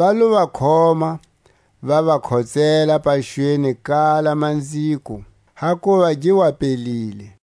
Va lo va khoma, va va khotsela paxweni kala manziko, hakuva gi wa pelile.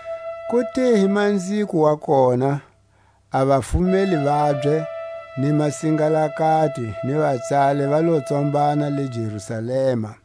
Ku te hi manziko wa kona, a vafumeli vabye, ni masingalakati, ni vatsali va lo tsombana ta Jerusalema;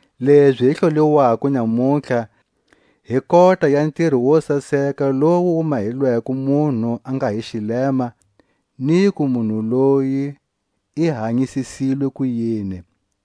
lezi hi hloliwako nyamutlha hi kota ya ntiro wo saseka lowu wu mahelweko munhu a nga hi xilema, niku munhu loyi i hanyisisilwe kuyini;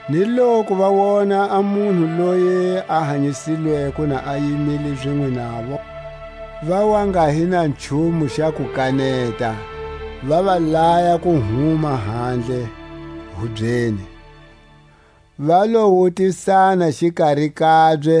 Ni loku va wona a munhu loyi a hanyisilweko na a yimile zinwe navo, va wa nga hi na nchumu xa ku kaneta, va va laya ku huma handle ka hubye. Va lo wutisana xikari kabye,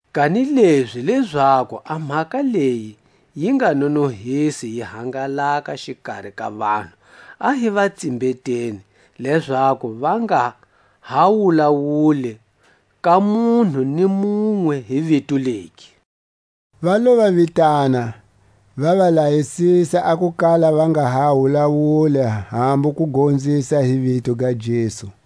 Kanilezi lezaku a mhaka leyi yi nga nonohisi yi hangalaka xikari ka vanhu, a hi va tsimbeteni, lezaku va nga ha wulawuli ka munhu ni munwe hi vito legi. Va lo va vitana, va va layisisa a ku kala va nga ha wulawuli hambu ku gonzisa hi vito ga Jesu.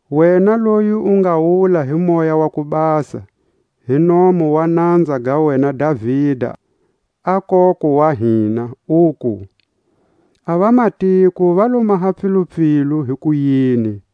wena loyi u nga wula hi Moya wa ku Basa, hi nomu wa nanza ga wena Davida a koko wa hina, uku: A vamatiko va lo maha pfilupfilu hikuyini,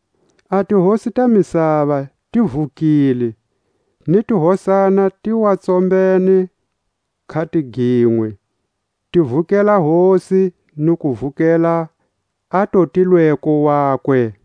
A tihosi ta misava ti vukile, Ni tihosana ti wa tsombene khatiginwe, Ti vukela Hosi ni ku vukela a Totilweko wakwe.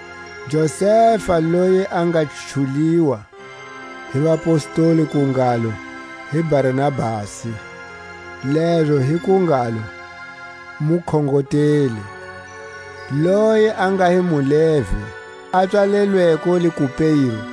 Josefa, loyi a nga chuliwa hi vapostoli ku ngalo hi Barnabasi, lezo hi ku ngalo, Mukhongoteli, loyi a nga hi muLevi, a pswalelweko le Kupero,